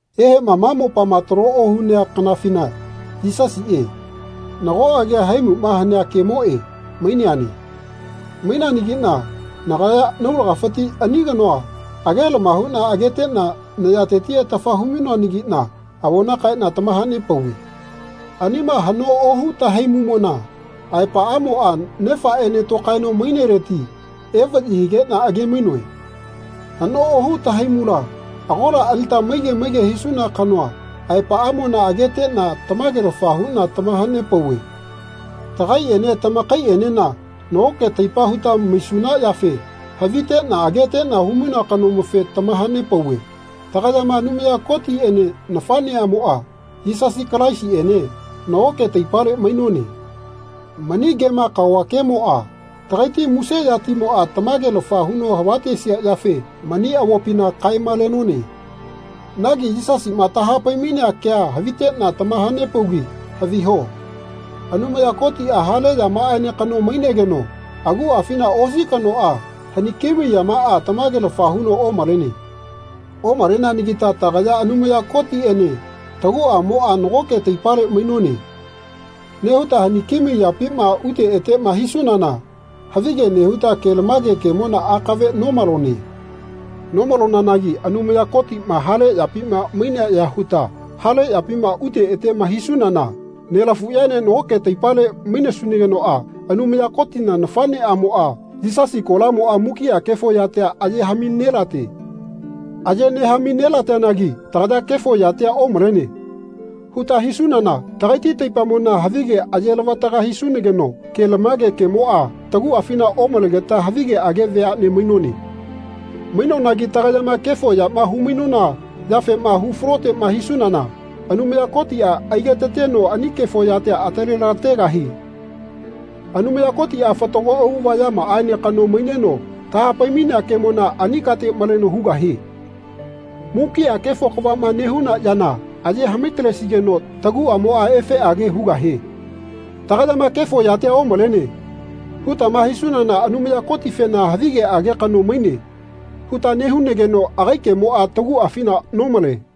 Ehema ma mopama talo ohunea kanafina Yisasie, nago agia Haimuma Hanea Kemoe, maineane. Maineanagina nagaya naulagafiti ani kanoa agelama huna agetena nayateti atafa hu-mainoanagina avona kaena tamahanepauve. Anima hano ohu tahaimumona aepaamoa Nefaene tokaeno maineleti evayi higena age-mainoe. Hano ohu tahaimula agola alita maige maige hisuna kanoa aepaamona agetena tamagelafa huna tamahanepauve. Tagaiene tamakaienena nagoke taipa huta maisuna yafe havitena agetena humainoa kanomofe tamahanepauve. Tagayama Anumaya Kotiene nafaneamoa, Yisasi Kalaisiene, nagoke taipale mainone. Mani kema kaova kemoa tagaiti muse yatimoa tamagelafa huno havatesia yafe mani avopina kae-malenone. Nagi Yisasima tahapai-mainea kea havitena tamahanepaugi haviho. Anumaya Kotia hale yamaaene kano mainegeno aguafina osi kanoa haniki mai yamaa tamagelafa huno omalene. Omaleanagita tagaya Anumaya Kotiene taguamoa nagoke taipale mainone. nehuta haniki mai yapima ute etema hisunana havige nehuta kelamage kemona akave nomalone. Nomalonanagi Anumaya Kotima hale yapima mainea ya huta hale yapima ute etema hisunana nelafuyaene nagoke taipale maisunagenoa Anumaya Kotina nafaneamoa, Yisasi kolamoa mukia kefo yatia aye hami nelate. Aye nehami nelateanagi tagaya Kefo yatia omalene. huta hisunana tagaiti taipamona havige aye lavataga hisunageno kelamage kemoa taguafina omalegeta havigeage veane mainone. Mainonagi tagayama kefo yama hu-mainona yafema hu falotema hisunana Anumaya Kotia aigetateno ani kefo yatia atalelategahie. Anumaya Kotia fatago auava yamaaene kano maineno tahapai-mainea kemona ani kate maleno hugahie. Mukia kefo kavama nehuna yana aye hami-talesigeno taguamoa efeage hugahie. Tagayama Kefo yatia omalene. hutama hisunana Anumaya Kotifena Havigeage kano maine. huta nehunageno agai kemoa taguafina nomale.